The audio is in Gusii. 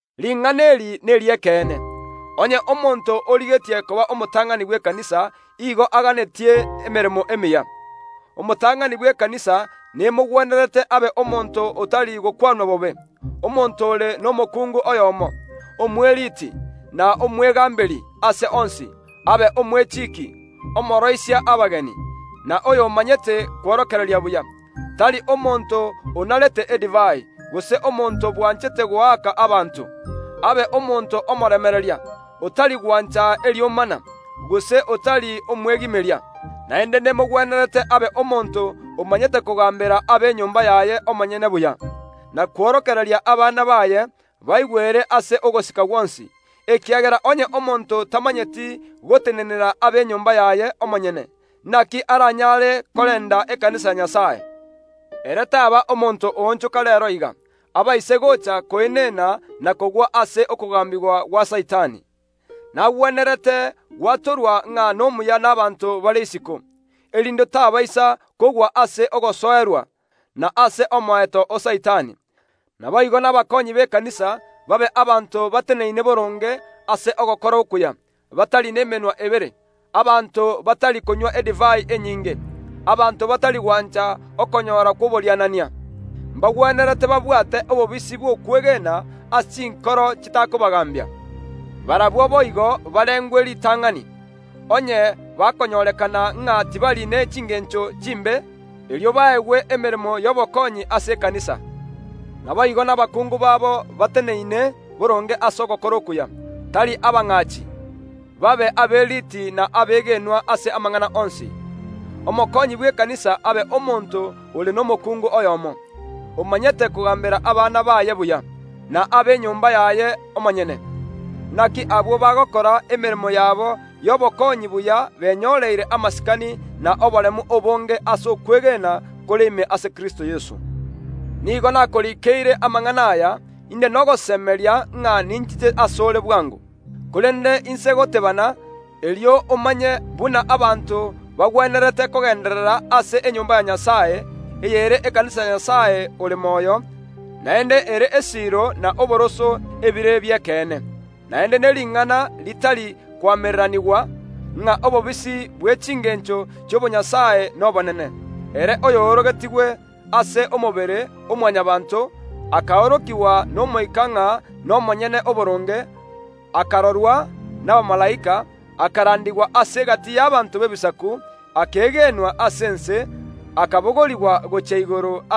Ring’ana eri neri’ekeene, onye omonto origetie koba omotang’ani bw’ekanisa, igo aganetie emeremo emiya. Omotang’ani bw’ekanisa nemogwenerete abe omonto otari gokwanwa bobe, omonto ore nomokuungu oyomo, omweriiti, na omwechiiki omwegaamberi ase onsi, abe, omooroisia abageni, na oy’omanyete kworokereria buya, tari omonto onarete edivai, gose omonto bwanchete goaka abanto, abe omonto omoremereria, otari gwancha eriomana, gose otari omwegimeria. Naende nemogwenerete abe omonto omanyete kogambera enyomba yaye omonyene buya, na kworokereria abana baye baigwere ase ogosika gwonsi, ekiagera onye omonto tamanyeti gotenenera enyomba yaye omonyene, inaki aranyare korenda ekanisa ya Nyasae? Ere taaba omonto oonchoka reero iga, abaise goocha koenena na kogwa ase okogaambigwa gwa Saitani. Nagwenerete gwatorwa ng’a nomuya nabaanto bare isiko, erinde tabaisa kogwa ase ogosoerwa, na ase omoeto o Saitani. Naboigo nabakoonyi b’ekanisa babe abanto bateneneine boronge ase ogokora okuya, batari nemenwa ebere, abanto batari konywa edivai enyinge, abanto batari gwancha okonyora kw’oborianania. Mbagwenerete babwate obobisi bw’okwegena ase chinkoro chitakobagaambia. Barabwo boigo barengwe ritang’ani: onye bakonyorekana ng’a tibari ne chingeencho chimbe, erio baegwe emeremo y’obokonyi ase ekanisa. Naboigo nabakungu babo bateneine boronge ase ogokora okuya, tari abang’achi, babe aberiiti na abegenwa ase amang’ana onsi. Omokonyi bw’ekanisa abe omonto ore nomokuungu oyomo, omanyete kogaambera abana baye buya, nenyomba yaye omonyene. Inaki abwo bagokora emeremo yabo y’obokonyi buya benyoreire amasikani na oboremu obonge ase okwegena kore ime ase Kristo Yeso. Nigo nakoriikeire amang’ana aya, inde nogosemeria ng’a ninchiche ase ore bwango. Korende inse goteebana, erio omanye buna abanto bagwenerete kogeenderera ase enyomba ya Nyasae, ey’ere ekanisa ya Nyasae ore moyo, naende ere esiiro na oboroso ebire bi’ekeene. Naende ne ring’ana ritari koamereranigwa, ng’a obobisi bwe chingencho chi’obonyasae nobonene: Ere oyoorogetigwe ase omobere o Mwanyabaanto, akaorokigwa n’Omoika koba omonyene oboronge, akarorwa nabamalaika, akarandigwa ase egati y’abanto b’ebisaku, akegenwa ase ense, naende akabogorigwa gochia igoro.